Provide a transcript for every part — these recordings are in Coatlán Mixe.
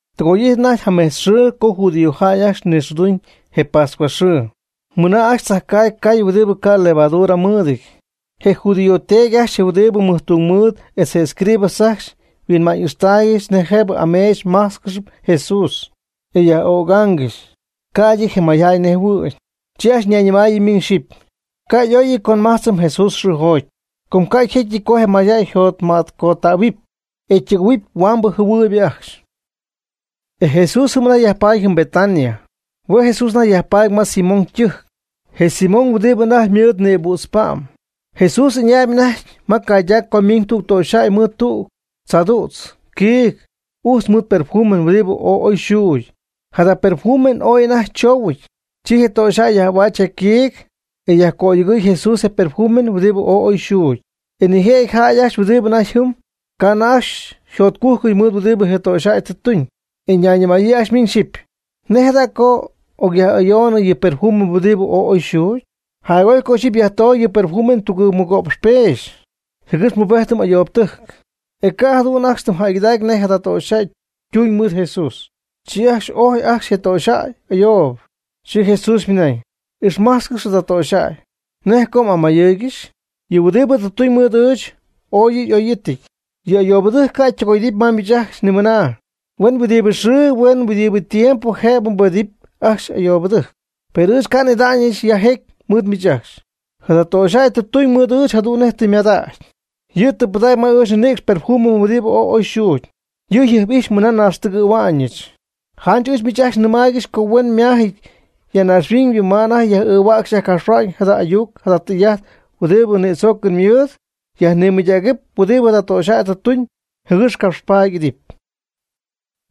Tɨgoy'ijtnɨ anajty mejtz xɨɨ co judíojäy ajcxy nixɨɨduna'ñ je pascua xɨɨ, mɨna ajcxy tzajcaagy cay huɨdibɨ ca' levadura mɨɨdɨty. Je judío teedy ajcxy huɨdibɨ jacmɨjtungmɨɨd etz je escribas ajcxy huinma'ñ'ixtaaygɨxy nej jëb ameech májtzcɨxɨpy Jesús, e yaj'ögaangɨxy, ca'ydɨ je mayjäy nejhuɨ̈y. Chi ajcxy ñayñɨmayɨ miñ xyɨpy: ―Ca' y'óyɨty co nmájtzɨm Jesús xɨɨjoty. Com ca' yjécyɨty co je mayjäy yjotmätcottähuɨpy, e ytɨgɨ̈huɨp huambɨ jɨhuɨɨyb ajcxy. E Jesús jɨm anajty yajpaady jɨm Betania. Hue' Jesús anajty yajpaady ma Simón ytɨjc, je Simón huɨdibɨ anajty ymɨɨd nïbüdz pa'm. Jesús ɨñaayb anajty ma caydac co ymiiñ tüg töxyjäy mɨɨd tüg tzaadüdz quiig ujtz mɨɨd perfume huɨdibɨ ooy oy yxuugy. Jada perfume ooy anajty chóohuɨty. Chi je töxyjäy yaj'ahuäch je quiig, e yajcöyogɨy Jesús je perfume huɨdibɨ ooy oy yxuugy. E nijëjɨty jäy ajcxy huɨdibɨ anajty jɨm, ca' anajty ajcxy yjotcújcɨty mɨɨd huɨdibɨ je töxyjäy tɨ tuñ, e ñayñɨmayɨ ajcxy miñ xyɨpy: ―¿Nej jada co ocyaj'ayoonɨ yɨ perfume huɨdibɨ ooy oy yxuugy? Jac'oy co ixyipy yajtoogy yɨ perfume tugɨɨg mɨgo'px peexy, jɨgɨx yajpubedɨpy ayoobtɨjc. E ca' jadu'n ajcxy tɨm jäygɨdacy nej je töxyjäy ytuuñ mɨɨd Jesús, chi ix'ojy ajcxy je töxyjäy ayoob. Chi Jesús ymɨnañ: ―Ixmajtzcɨx jada töxyjäy. ¿Nej co m'amayɨɨygɨxy? Yɨ huɨdibɨ tɨ tuñ mɨɨd ɨɨch, ooy yɨ' y'óyɨty. Je ayoobtɨjc ca' ytɨgoy'idɨpy ma miich ajcxy nimɨna. Huen huɨdibɨ xɨɨ huen huɨdibɨ tiempo jëb mbubedɨp ajcxy ayoobtɨjc. Per ɨɨch ca' n'ida'ñɨch ya jecy mɨɨd miich ajcxy. Jada töxyjäy tɨ tuñ mɨɨd ɨɨch jadu'n nej tɨ ymadägy. Yɨ' tɨ pɨdägy ma ɨɨch nninïcx perfume huɨdibɨ ooy oy yxuugy. Yɨ' jɨjp'ijxpy mɨna naaxtɨgɨ̈hua'ñɨch. Janch ɨɨch miich ajcxy nɨmaaygɨxy co huen yma'ámyɨty ya naaxhuiñ ma anajty yaj'ɨɨhuäcxy yajcapxhuäcxy jada ayuc jada tɨy'ajt huɨdibɨ nïdzoocɨn mɨɨd, yajnimɨydägɨpy huɨdi jada töxyjäy tɨ tuñ, jɨgɨx capxpaady y'idɨpy.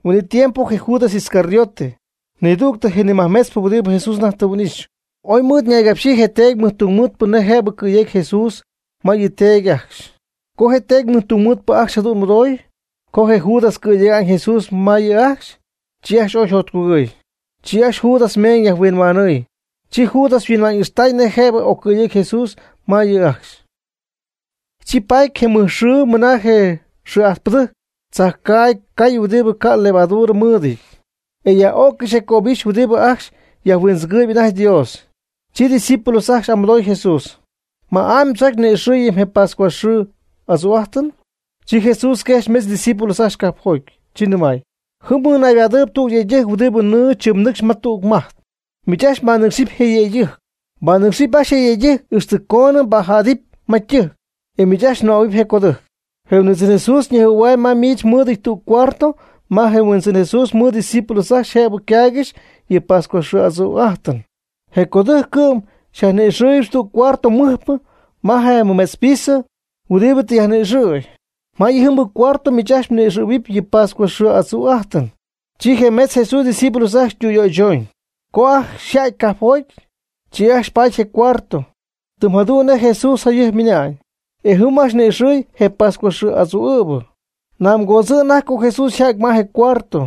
Huin'it tiempo je Judas Iscariote, nidüg je nimajmetzpɨ huɨdibɨ Jesús anajty tɨ huin'ixy, oy mɨɨd ñaygapxyii je teedy mɨjtungmɨɨdpɨ nej jëb cɨ̈yejcy Jesús ma yɨ teedy ajcxy. Co je teedy mɨjtungmɨɨdpɨ ajcxy jadu'n mɨdoy, co je Judas cɨ̈yega'ñ Jesús ma yɨ' ajcxy, chi ajcxy ooy yjotcugɨɨy. Chi ajcxy Judas meeñ yajhuinhuanɨɨy. Chi Judas yhuinma'ñ'ixtay nej jëb occɨ̈yecy Jesús ma yɨ' ajcxy. Chi paty je mɨj xɨɨ mɨna je xɨɨ'ajtpɨdɨjc tzajcaagy cay huɨdibɨ ca'p levadura mɨɨdɨty, e yaj'öccɨxy je cöbixy huɨdibɨ ajcxy yajhuindzɨgɨɨyb anajty Dios. Chi ydiscípulos ajcxy y'amɨdooy Jesús: ―¿Ma'amy mdzocy co ni'ixɨɨyɨm je pascua xɨɨ adzu'ájtɨn? Chi Jesús quejxy metz ydiscípulos ajcxy cajpjoty, chi nɨmay: ―Jɨm mɨɨd mnaybadɨɨyb tüg yëydɨjc huɨdibɨ nɨɨ tzɨmnɨcxp ma tüg majt. Miich ajcxy mbanɨcxɨɨyb je yëydɨjc. Mbanɨ́cxɨpy ajcxy je yëydɨjc, ixtɨ coon mbajädɨpy ma ytɨjc. E miich ajcxy mnɨmähuɨpy je codɨjc: “Je Huindzɨn Jesús ñejhuɨ̈huam ma miich mɨɨdɨty tüg cuarto ma je Huindzɨn Jesús mɨɨd ydiscípulos ajcxy jëb caaygɨxy yɨ pascua xɨɨ adzu'ájtɨn.” Je codɨjc cɨ'm xyajni'ixɨ́ɨygɨxyɨp tüg cuarto mɨjpɨ ma je mɨmetz piso huɨdibɨ tɨ yajni'ixɨ̈y. Ma yɨjɨmbɨ cuarto miich ajcxy mni'ixɨ̈huɨpy yɨ pascua xɨɨ adzu'ájtɨn. Chi je metz Jesús ydiscípulos ajcxy tüyöychooñ. Co ajcxy yja'ty cajpjoty, chi ajcxy paty je cuarto, tɨm jadu'n nej Jesús jayɨjp ymɨnañ. E jɨm ajcxy ni'ixɨ̈y je pascua xɨɨ adzu'ɨ̈bɨ. Nam coodzɨɨyñɨ anajty co Jesús yja'ty ma je cuarto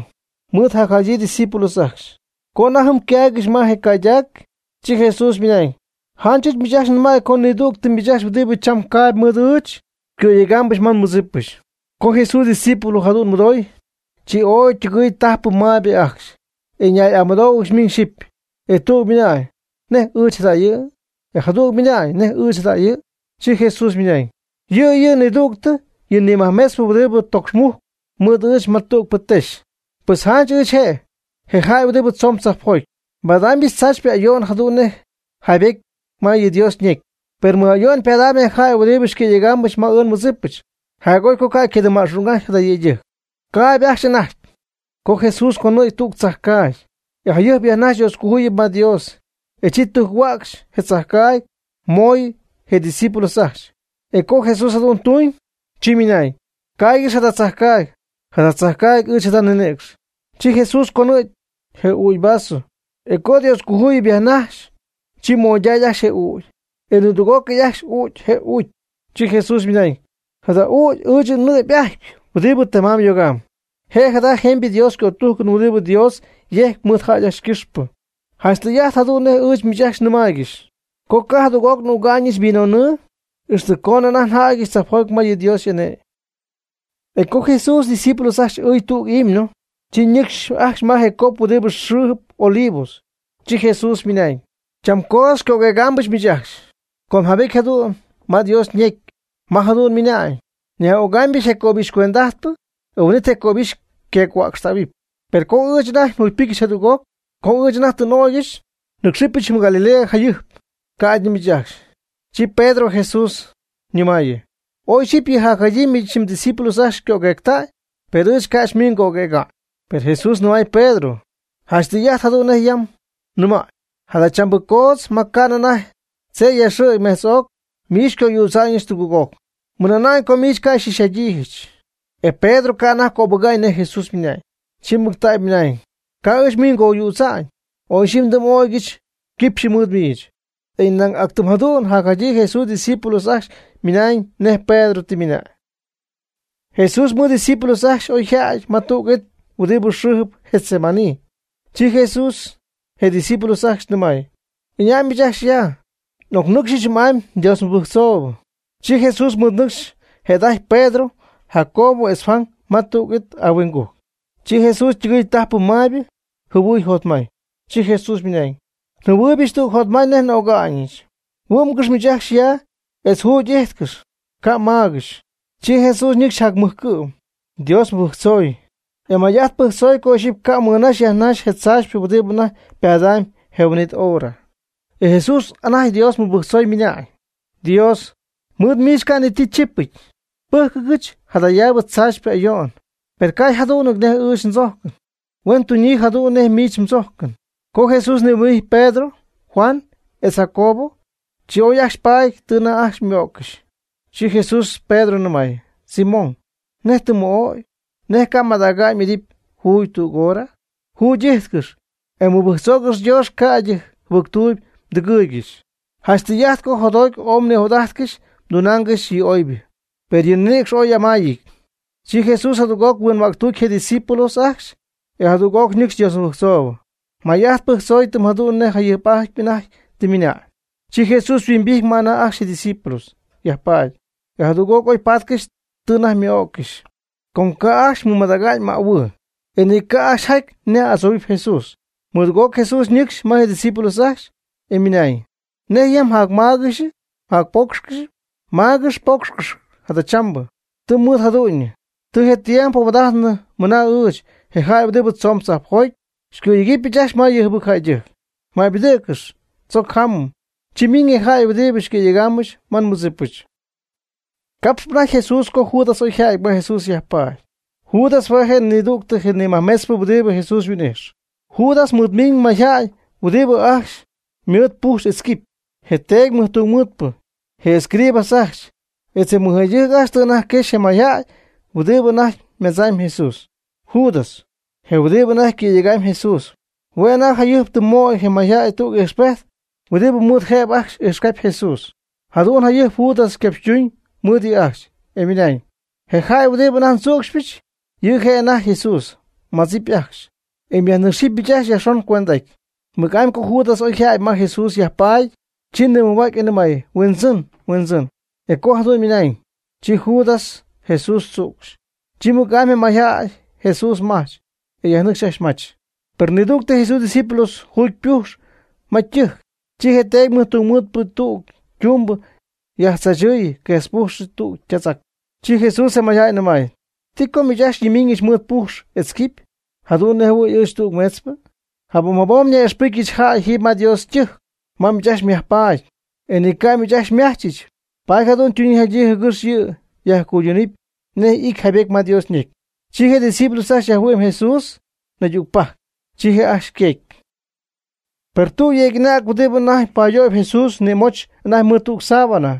mɨɨd jacjadyii ydiscípulos ajcxy. Co anajty jɨm ycaaygɨxy ma je caydac, chi Jesús ymɨnañ: ―Janch ɨɨch miich ajcxy nɨmay co nidüg miich ajcxy huɨdibɨ cham caayb mɨɨd ɨɨch, xycɨ̈yegaambɨch ma nmɨdzípɨch. Co je Jesús ydiscípulos jadu'n mɨdooy, chi ooy ytɨgɨɨy tajpɨ maybɨ ajcxy, e ñay'amɨdóohuɨgɨxy miñ xyɨpy, e tüg ymɨnañ: ―¿Nej ɨɨch jada'jɨ? E jadüg ymɨnañ: ―¿Nej ɨɨch jada'jɨ? Chi Jesús ymɨnañ: ―Yɨ' yɨ' nidügtɨ yɨ nimajmetzp huɨdibɨ tocxmujcp mɨɨd ɨɨch ma tügpɨ texy. Pues janch ɨɨch je', je jäy huɨdibɨ tzoon tzajpjoty, nbadaamybɨch tzaachypɨ ayo'n jadu'n nej yjaybétyɨty ma yɨ Dios ñecy. Per mɨj ayo'n pada'ñ je jäy huɨdibɨ xycɨ̈yegaamɨch ma ɨɨch nmɨdzip. Jac'oy co ca' ycadɨmma'xung'ajty jada yëydɨjc. Caayb ajcxy anajty, co Jesús conɨ̈gy tüg tzajcaagy, e jayɨjp yajnajx Dioscojuyip ma Dios, e chi tujc-huäcxy je tzajcaagy, moy je' ydiscípulos ajcxy. E co Jesús jadu'n tuñ, chi ymɨnañ: ―Caaygɨx jada tzajcaagy. Jada tzajcaagy ɨɨch jada nninïcx. Chi Jesús conɨ̈gy je ügy vaso, e co Dioscojuyip yajnajxy, chi moyday ajcxy je ügy, e nidüg'ócɨy ajcxy uucy je ügy. Chi Jesús ymɨnañ: ―Jada ügy ɨɨch nnɨ'py'ajtpy huɨdibɨ temamb yogamb. Je' jada jemybɨ Dios ycötújcɨn huɨdibɨ Dios yejc mɨɨd jäy ajcxy ycɨxpɨ. Janch tɨy'ajt jadu'n nej ɨɨch miich ajcxy nimaaygɨxy, co ca' jadüg'oc n'üga'ñɨch vino nɨɨ, ixtɨ coonɨ anajty njädyɨch tzajpjoty ma yɨ Dios y'ane'my. E co Jesús etz ydiscípulos ajcxy ɨɨy tüg himno, chi ñɨcxy ajcxy ma je cop huɨdibɨ xɨɨjɨp Olivos. Chi Jesús ymɨnañ: ―Cham coodz xycöguëgaambɨch miich ajcxy, com jaybety jadu'n ma Dios ñecy ma jadu'n ymɨnañ: “Nyaj'ögaamybɨch je cöbixy cuend'ajtpɨ, e huin'it je cöbixy queeg-huäcxtähuɨp.” Per co ɨɨch anajty njugypɨ́cyɨch jadüg'oc, co ɨɨch anajty tɨ n'ögyɨch, nɨ́cxɨbɨch jɨm Galilea jacjayɨjp, ca'ydɨ miich ajcxy. Chi Pedro Jesús nɨmaayɨ: ―Oy ixyipy yɨ jacjadyii miich mdiscípulos ajcxy xycöguectäy, per ɨɨch ca' miich ngöguëga'ñ. Per Jesús nɨmay Pedro: ―Janch tɨy'ajt jadu'n nej yam nɨmäy, jadachambɨ coodz ma ca'nɨ anajty tzeyyaxɨ̈gy mejtz'oc miich xycoyüdza'ñɨch tugɨɨg'oc, mɨna'na'ñ co miich ca' xy'ixy'adyiijɨch. E Pedro ca' anajty cöbɨga'ñ nej Jesús ymɨnañ, chi mɨctägy mɨnañ: ―Ca' ɨɨch miich ngoyüdza'ñ, oy ixyipy ndɨm'o'cɨch quipxy mɨɨd miich. E nañ actɨm jadu'n jacjadyii Jesús ydiscípulos ajcxy ymɨnañ nej Pedro tɨ ymɨnañ. Jesús mɨɨd ydiscípulos ajcxy oyja'ty ma tüg it huɨdibɨ xɨ́ɨjɨp Getsemaní, chi Jesús je ydiscípulos ajcxy nɨmay: ―Ɨña' miich ajcxy ya, namɨ n'ocnɨcxyɨch jɨm'amy Dios mɨbɨjctzoob. Chi Jesús mɨɨd nɨcxy jëda'ajty Pedro, Jacobo etz Juan ma tüg it ahuingujc. Chi Jesús ytɨgɨɨy tajpɨ maybɨ jɨhuɨɨy jotmay. Chi Jesús ymɨnañ: ―Njɨhuɨɨybɨch tüg jotmay nej n'öga'ñɨch. Huɨ́'mgɨx miich ajcxy ya etz juugy m'íjtcɨxɨpy, ca' mmáagɨxɨpy. Chi Jesús ñɨcxy jac'amɨjcɨ'm, Dios mɨbɨjctzoy, e may'ajt pɨjctzoy co ixyipy ca' mɨnaxy yajnaxy je tzaachypɨ huɨdi anajty ypadamy je huin'it hora. E Jesús anajty Dios mɨbɨjctzoy ymɨna'ñ: ―Dios, mɨɨd miich ca' ni ti chípɨty. Pɨ́jcɨgɨch jadayaabɨ tzaachypɨ ayo'n, per ca' yjadú'nɨty nej ɨɨch ndzójcɨn, huen tuñyii jadu'n nej miich mdzójcɨn. Co Jesús nihuimbijty Pedro, Juan, etz Jacobo, chi oy ajcxy paady tɨ anajty ymɨ'ó'ccɨxy. Chi Jesús Pedro nɨmay: ―Simón, ¿nej tɨ mmɨ'ögy? ¿Nej ca' mmadäga'ñ m'idɨpy juugy tüg hora? Jugy'íjtcɨx, e mɨbɨjctzoogɨx Dios ca'ydɨ jɨbɨctuuyb mdɨgɨɨygɨxy. Janch tɨy'ajt co jotjoty ooy mnijot'ájtcɨxy mdunaangɨxy yɨ oybɨ. Per yɨ mninïcx oy amaayɨty. Chi Jesús jadüg'oc huinhuäctuuty je' ydiscípulos ajcxy, e jadüg'oc ñɨcxy Dios mɨbɨjctzoob. May'ajt pɨjctzoy tɨm jadu'n nej je jayɨjp'atypɨ anajty tɨ ymɨna'ñ. Chi Jesús yhuimbijty ma anajty ajcxy ydiscípulos yajpaady, e jadüg'oc oy pátcɨxy tɨ anajty ymɨ'öccɨxy, com ca' ajcxy mɨmadägy mähuɨɨ, e ni ca' ajcxy jajty nej adzohuɨpy Jesús. Mɨdugɨɨg'oc Jesús ñɨcxy ma je' ydiscípulos ajcxy, e ymɨnañ: ―¿Nej ya mjacmáagɨxp mjacpoocxcɨxp? Maagɨx poocxcɨx jadachambɨ. Tɨ mɨɨd jadu'ñyɨ. Tɨ je tiempo huaad'ájtnɨ mɨna ɨɨch, je jäy huɨdibɨ tzoon tzajpjoty, xycɨ̈yegɨpy ajcxy ma yɨ jɨbɨc jäydɨjc. Maybɨdɨ̈gcɨx, tzoc jámɨm. Chi ymiiñ je jäy huɨdibɨ xycɨ̈yegaambɨch ma nmɨdzípɨch. Capxp anajty Jesús, co Judas oyjäty ma Jesús yajpaady. Judas hue' je' nidügtɨ je majmetzpɨ huɨdibɨ Jesús yhuin'ijx. Judas mɨɨd miiñ mayjäy huɨdibɨ ajcxy mɨɨd pujx etz quipy. Je teedy mɨjtungmɨɨdpɨ, je escribas ajcxy, etz je mɨjjäydɨjc ajcxy tɨ anajty quexy je mayjäy huɨdibɨ anajty madzamb Jesús. Judas, je huɨdibɨ anajty cɨ̈yegamb Jesús, hue' anajty jayɨjp tɨ moy je mayjäy tüg ijxpejt huɨdibɨ mɨɨd jëb ajcxy ijxcabip Jesús. Jadu'n jayɨjp Judas ycapxytuñ mɨɨd yɨ' ajcxy, e ymɨnañ: ―Je jäy huɨdibɨ anajty ndzücxypɨch, yɨ' je' anajty Jesús. Madzɨpy ajcxy, e myajnɨ́cxɨp miich ajcxy yajxon cuend'aty. Mɨc'amy co Judas oyjädy ma Jesús yajpaady, chi nimɨjhua'cy, e nɨmay: ―Huindzɨn, Huindzɨn. E co jadu'n ymɨnañ, chi Judas Jesús tzücxy. Chi mɨc'amy je mayjäy Jesús mach, e yajnɨcxy ajcxy mach. Per nidügtɨ Jesús ydiscípulos juudy ypujxy ma ytɨjc, chi je teedy mɨjtungmɨɨdpɨ tüg ytumbɨ yajtzaachɨɨyɨ, quejtzpujxɨ tüg ytätzac. Chi Jesús je mayjäy nɨmay: ―¿Ti co miich ajcxy xyñimiiñɨch mɨɨd pujx etz quipy, jadu'n nej jɨhuɨ̈y ɨɨch tüg meetzpɨ? Jabom jabom nyaj'ixpɨjcyɨch jäy jiiby ma Dios ytɨjc ma miich ajcxy myajpaady, e ni ca' miich ajcxy xymajchɨch. Paady jadu'n ytunyii yjadyii jɨgɨx yɨ' yajcuydumb nej ity jaybety ma Dios ñecy. Chi je' ydiscípulos ajcxy yajhuɨ'my Jesús naydügpajc. Chi je' ajcxy yqueegy. Per tüg yujcyeeg anäg huɨdibɨ anajty payöy Jesús nïmóchɨty anajty mɨɨd tüg sábana.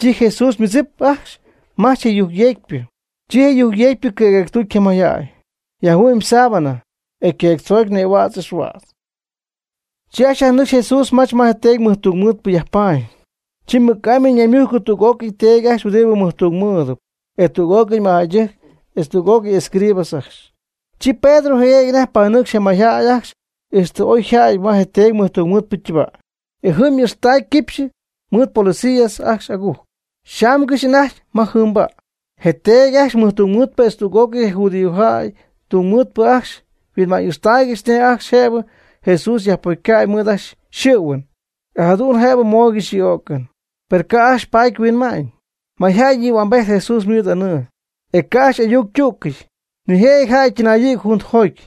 Chi Jesús ymɨdzip ajcxy majch je yujcyeegpɨ. Chi je yujcyeegpɨ cɨ̈queegtuty je mayjäy, yajhuɨ'my ysábana, e yquecytzögy nïhuädz ixhuädz. Chi ajcxy yajnɨcxy Jesús mach ma je teedy mɨjtungmɨɨdpɨ yajpaady. Chi mɨc'amy ñaymujcɨ tüg'ócɨy teedy ajcxy huɨdibɨ mɨjtungmɨɨdɨp, e tüg'ócɨy mɨjjäydɨjc, etz tüg'ócɨy escribas ajcxy. Chi Pedro jɨguëgy anajty panɨcxy je mayjäy ajcxy ixtɨ oy yja'ty ma je teedy mɨjtungmɨɨdpɨ ytɨba'. E jɨm ixtacy quipxy mɨɨd policía ajcxy agujc, yxaamgɨxy anajty ma jɨɨnba'. Je teedy ajcxy mɨjtungmɨɨdpɨ etz tüg'ócɨy je judíojäy ytungmɨɨdpɨ ajcxy yhuinma'ñ'ixtaaygɨxy nej ajcxy jëb Jesús yajpocyca' mɨɨd ajcxy yxɨ̈huɨn, e jadu'n jëb mooygɨxy yɨ öcɨn. Per ca' ajcxy paady huinma'ñ. Mayjäy nïhuambejty Jesús mɨɨd anɨɨ, e ca' ajcxy y'ayuc ytügɨy. Nijëjɨty jäy ytɨnayɨ̈gy juntajoty,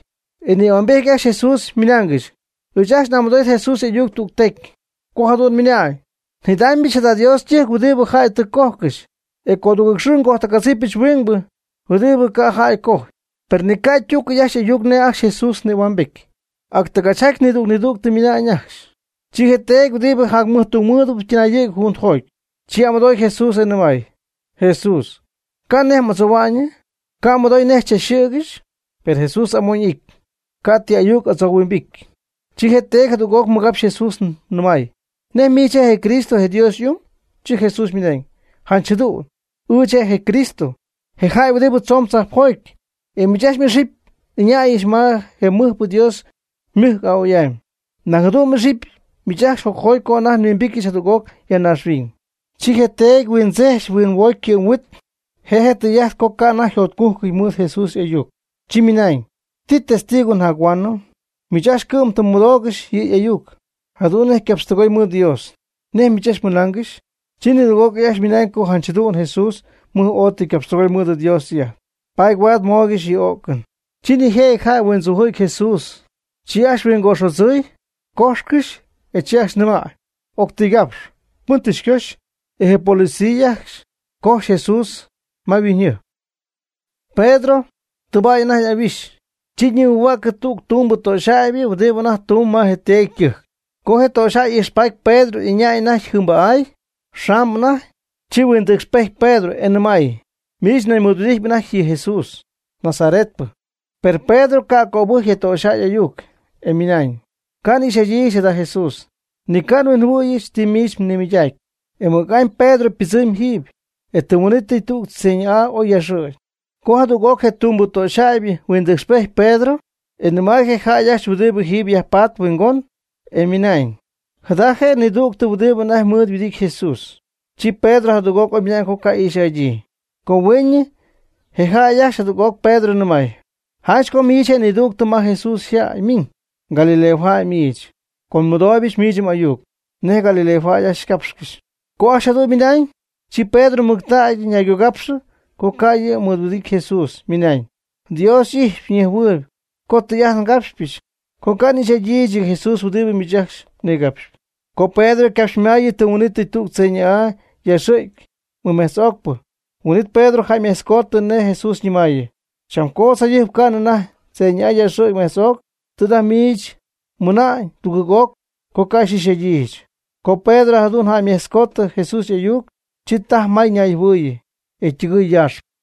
e nïhuambety ajcxy Jesús, ymɨnaangɨxy: ―Ɨɨch ajcxy amɨdo'ijt Jesús y'ayuc tüg tecy, co jadu'n ymɨnañ: “Njidaamybɨch jada Dios ytɨjc huɨdibɨ jäy tɨ cójcɨxy, e codugɨɨg xɨɨ gojtɨgadzipɨch huingbɨ huɨdibɨ ca' jäy cojy.” Per ni ca' ytügɨɨy ajcxy y'ayuc nej ajcxy Jesús nïhuambejty, ac tɨgachjaty nidüg nidüg ymɨnañ ajcxy. Chi je teedy huɨdibɨ je jacmɨjtungmɨɨd ytɨnayɨ̈gy juntajoty, chi y'amɨdooy Jesús e nɨmay: ―Jesús, ¿ca' nej m'adzohua'ñyɨ? ¿Ca' mmɨdoy nej xychachxɨ̈gɨxy? Per Jesús amoñ y'ijty. Ca' ti ayuc adzohuimbijty. Chi je teedy jadüg'oc mɨgapxy Jesús nɨmay: ―¿Nej miich je' je Cristo, je Dios y'ung? Chi Jesús ymɨnañ: ―Janch jadu'n, ɨɨch je' je Cristo, je jäy huɨdibɨ tzoon tzajpjoty, e miich ajcxy xy'ixɨpɨch ɨñäyɨch ma je mɨjpɨ Dios ymɨjc a'oy'amy. Nañ jadu'n xy'ixɨpyɨch miich ajcxy jocjoty co anajty nhuimbityɨch jadüg'oc ya naaxhuiñ. Chi je teedy huindzech huinhuocy ycɨ'm yhuit, je' je' tɨy'ájtɨp co ca' anajty yjotcújcɨty mɨɨd Jesús y'ayuc, chi ymɨnañ: ―¿Ti testigo njac-huaanɨm? Miich ajcxy cɨ'm tɨ mmɨdoogɨxy yɨ' y'ayuc, jadu'n nej ycapxtɨgoy mɨɨd Dios. ¿Nej miich ajcxy mɨnaangɨxy? Chi nidüg'ócɨy ajcxy ymɨnañ co janch jadu'n Jesús mɨj oy tɨ ycapxtɨgoy mɨɨd Dios ytɨy'ajt, paady huaad mooygɨxy yɨ o'cɨn. Chi nijëjɨty jäy yhuindzujɨ̈gy Jesús. Chi ajcxy huingoxodzɨy, cójxcɨxy, e chi ajcxy nɨmay: ―Octɨygapx. ¿Pɨn tɨ xycojxy? E je policiatɨjc ajcxy cojxy Jesús ma yhuiñyjɨjp. Pedro tɨbäy anajty y'ahuixy. Chi ñimɨjhuäcɨ tüg tumbɨ töxyjäybɨ huɨdibɨ anajty tumb ma je teedy ytɨjc. Co je töxyjäy ijxpaty Pedro ɨñäy anajty jɨɨnba'áy, yxaamb anajty. Chi huindɨcxpejty Pedro, e nɨmay: ―Miich nañ mɨɨdhuɨdijtpy anajty je Jesús yɨ Nazaretpɨ. Per Pedro ca' cöbɨjcy je töxyjäy y'ayuc, e ymɨnañ: ―Ca' n'ixy'adyiijɨch jada Jesús. Ni ca' nhuinjɨhuɨ̈yɨch ti miich nimɨydacpy. E mɨc'amy Pedro ypɨdzɨmy jiiby, e tɨm huin'ítɨy tüg tzeyñɨ'aa oy yaaxɨ̈gy. Chi jadüg'oc je tumbɨ töxyjäybɨ huindɨcxpejty Pedro, e nɨmay je jäy ajcxy huɨdibɨ jɨm yajpatp huingon, e ymɨnañ: ―Jada je' nidügtɨ huɨdi anajty mɨɨd huɨdity Jesús. Chi Pedro jadüg'oc ymɨnañ co ca' ix'adyii. Co hueeñɨ, je jäy ajcxy jadüg'oc Pedro nɨmay: ―Janch co miich je' nidügtɨ ma Jesús yjäy miñ, Galileo jäy miich, com nmɨdooybɨch miich m'ayuc nej Galileo jäy ycápxcɨxy. Co ajcxy jadu'n ymɨnañ, chi Pedro mɨctägy ñaygogapxɨ co ca' yɨ' mɨɨdhuɨdity Jesús, ymɨnañ: ―Dios y'ijxpy ñejhuɨɨyb co tɨy'ajt ngapxyɨch, co ca' n'ixy'adyiijɨch yɨ Jesús huɨdibɨ miich ajcxy mnigapxyp. Co Pedro ycapxymaayɨ tɨm huin'itɨy tüg tzeyñɨ'aa yaaxɨ̈gy mɨmejtz'ocpɨ. Huin'it Pedro jäymetzcoody nej Jesús ñɨmäyii: “Cham coodz jayɨjp ca'nɨ anajty tzeyñɨ'aa yaaxɨ̈gy metz'oc, tɨ anajty miich mɨna'ñ tugɨɨg'oc co ca' xy'ix'adyiijɨch.” Co Pedro jadu'n jäymejtzcoody Jesús y'ayuc, chi tajy may ñayjɨhuɨɨyɨ, e ytɨgɨɨy yaaxpɨ.